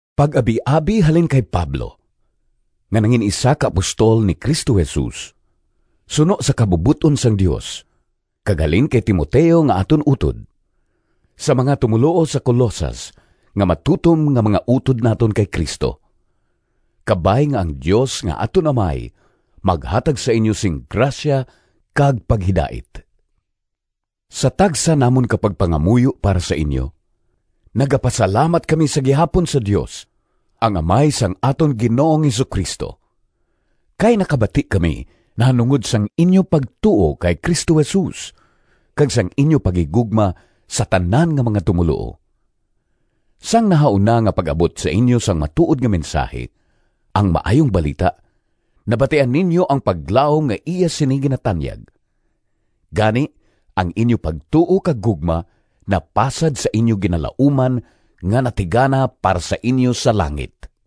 Pag-abiabi halin kay Pablo nga nangin-isa ka apostol ni Cristo Jesus suno sa kabubot-on sang Dios, kag halin kay Timoteo nga aton utod— Sa mga tumoluo sa Colosas nga matutom nga mga utod naton kay Cristo. Kabay nga ang Dios nga aton Amay maghatag sa inyo sing grasya kag paghidait. Sa tagsa namon ka pagpangamuyo para sa inyo, nagapasalamat kami sa gihapon sa Dios, ang Amay sang aton Ginoong Jesu-Cristo. Kay nakabati kami nahanungod sang inyo pagtuo kay Cristo Jesus, kag sang inyo paghigugma sa tanan nga mga tumoluo. Sang nahauna nga pag-abot sa inyo sang matuod nga mensahi, ang Maayong Balita, nabatian ninyo ang paglaom nga iya sini ginatanyag. Gani ang inyo pagtuo kag gugma napasad sa inyo ginalauman nga natigana para sa inyo sa langit.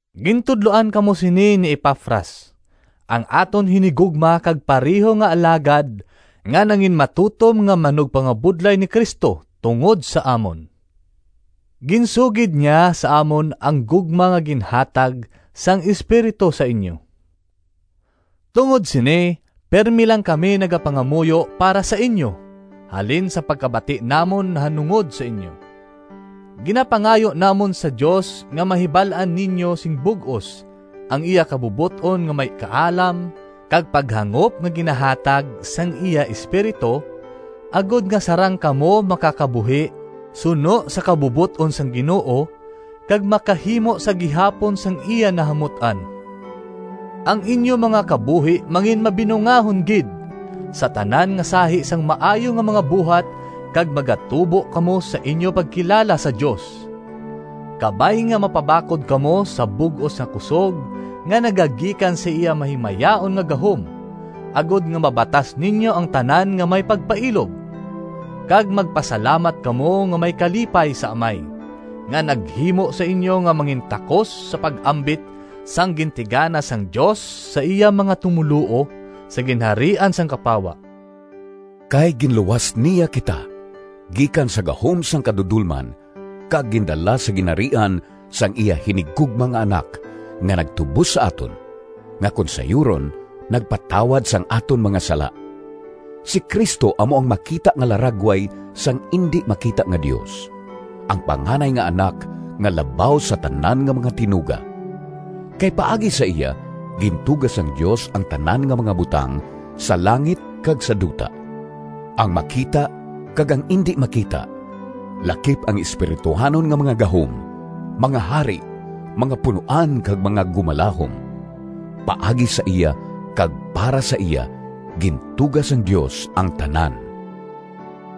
Gintudloan kamo sini ni Epafras, ang aton hinigugma kag pareho nga alagad nga nanginmatutom nga manugpangabudlay ni Cristo tungod sa amon. Ginsugid niya sa amon ang gugma nga ginhatag sang Espiritu sa inyo. Tungod sini, pirme lang kami nagapangamuyo para sa inyo halin sa pagkabati namon nahanungod sa inyo. Ginapangayo namon sa Dios nga mahibal-an ninyo sing bug-os ang iya kabubot-on nga may kaalam kag paghangop nga ginahatag sang iya Espiritu agod nga sarang kamo makakabuhi suno sa kabubot-on sang Ginoo, kag makahimo sa gihapon sang iya nahamut-an. Ang inyo mga kabuhi manginmabinungahon gid sa tanan nga sahi sang maayo nga mga buhat kag magatubo kamo sa inyo pagkilala sa Dios. Kabay nga mapabakod kamo sa bug-os nga kusog nga nagagikan sa iya mahimayaon nga gahom, agod nga mabatas ninyo ang tanan nga may pagpailob. Kag magpasalamat kamo nga may kalipay sa Amay, nga naghimo sa inyo nga mangintakos sa pag-ambit sang gintigana sang Dios sa iya mga tumoluo sa ginharian sang kapawa. Kay ginluwas niya kita gikan sa gahom sang kadudolman kag gindala sa ginharian sang iya hinigugma nga Anak, nga nagtubos sa aton, nga kon sayuron, nagpatawad sang aton mga sala. Si Cristo amo ang makita nga laragway sang indi makita nga Dios, ang panganay nga Anak nga labaw sa tanan nga mga tinuga. Kay paagi sa iya gintuga sang Dios ang tanan nga mga butang sa langit kag sa duta, ang makita kag ang indi makita lakip ang espirituhanon nga mga gahom, mga hari, mga punoan kag mga gumalahom. Paagi sa iya kag para sa iya gintuga sang Dios ang tanan.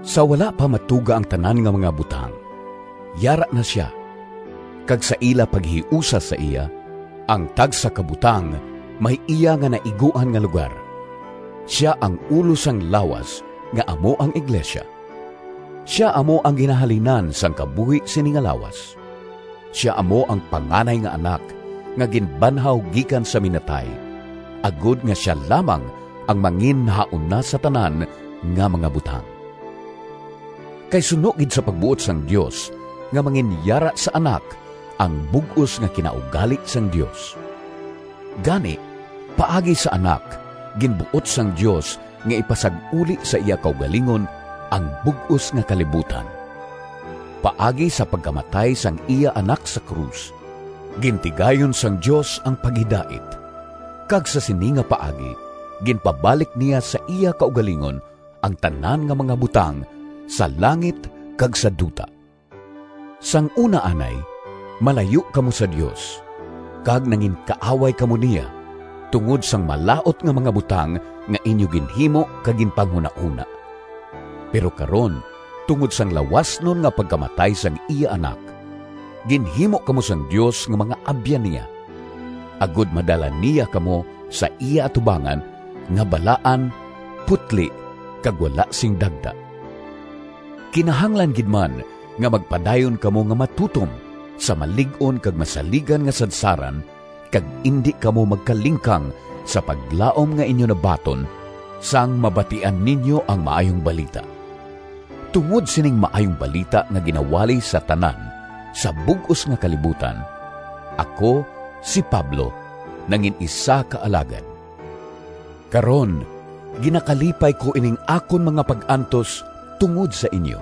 Sa wala pa matuga ang tanan nga mga butang yara na sia, kag sa ila paghiusa sa iya, ang tagsa ka butang may iya nga naiguan nga lugar. Sia ang ulo sang lawas nga amo ang iglesia. Sia amo ang ginahalinan sang kabuhi sini nga lawas. Sia amo ang panganay nga Anak nga ginbanhaw gikan sa minatay, agod nga sia lamang ang manginnahauna sa tanan nga mga butang. Kay suno gid sa pagbuot sang Dios nga manginyara sa Anak ang bug-os nga kinaugali sang Dios. Gani, paagi sa Anak ginbuot sang Dios nga ipasag-uli sa iya kaugalingon ang bug-os nga kalibutan. Paagi sa pagkamatay sang iya Anak sa krus, gintigayon sang Dios ang paghidait, kag sa sini nga paagi ginpabalik niya sa iya kaugalingon ang tanan nga mga butang sa langit kag sa duta. Sang una anay malayo kamo sa Dios, kag nanginkaaway kamo niya tungod sang malaut nga mga butang nga inyo ginhimo kag ginpanghunahona. Pero karon, tungod sang lawasnon nga pagkamatay sang iya Anak, ginhimo kamo sang Dios nga mga abyan niya, agod madala niya kamo sa iya atubangan nga balaan, putli kag wala sing dagta. Kinahanglan gid man nga magpadayon kamo nga matutom sa malig-on kag masaligan nga sadsaran kag indi kamo magkalingkang sa paglaom nga inyo nabaton, sang mabatian ninyo ang Maayong Balita. Tungod sining Maayong Balita nga ginawali sa tanan sa bug-os nga kalibutan, ako, si Pablo, nangin-isa ka alagad. Karon ginakalipay ko ining akon mga pag-antos tungod sa inyo.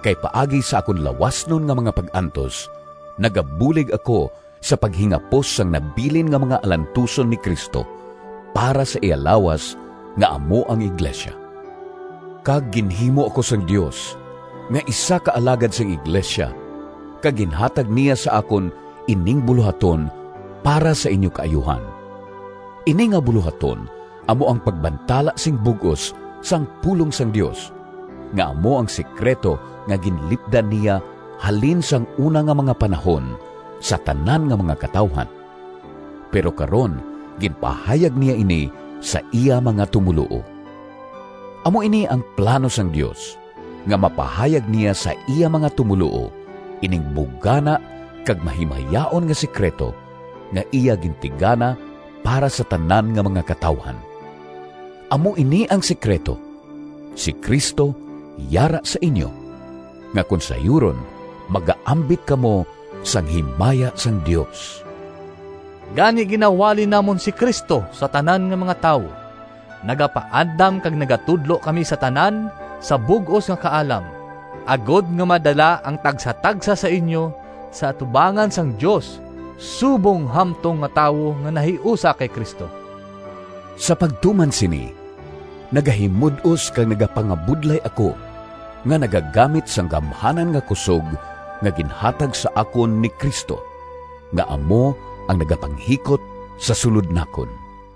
Kay paagi sa akon lawasnon nga mga pag-antos nagabulig ako sa paghingapos sang nabilin nga mga alantuson ni Cristo para sa iya lawas nga amo ang iglesia. Kag ginhimo ako sang Dios nga isa ka alagad sang iglesia kag ginhatag niya sa akon ining bulohaton para sa inyo kaayuhan. Ini nga bulohaton amo ang pagbantala sing bug-os sang pulong sang Dios, nga amo ang sekrito nga ginlipdan niya halin sang una nga mga panahon sa tanan nga mga katawuhan, pero karon ginpahayag niya ini sa iya mga tumoluo. Amo ini ang plano sang Dios: nga mapahayag niya sa iya mga tumoluo ining bugana kag mahimayaon nga sekrito, nga iya gintigana para sa tanan nga mga katawuhan. Amo ini ang sekrito: si Cristo yara sa inyo, nga kon sayuron, magaambit kamo sang himaya sang Dios. Gani ginawali namon si Cristo sa tanan nga mga tawo. Nagapaandam kag nagatudlo kami sa tanan sa bug-os nga kaalam, agod nga madala ang tagsatagsa sa inyo sa atubangan sang Dios subong hamtong nga tawo nga nahiusa kay Cristo. Sa pagtuman sini nagahimud-os kag nagapangabudlay ako nga nagagamit sang gamhanan nga kusog nga ginhatag sa akon ni Cristo nga amo ang nagapanghikot sa sulod nakon.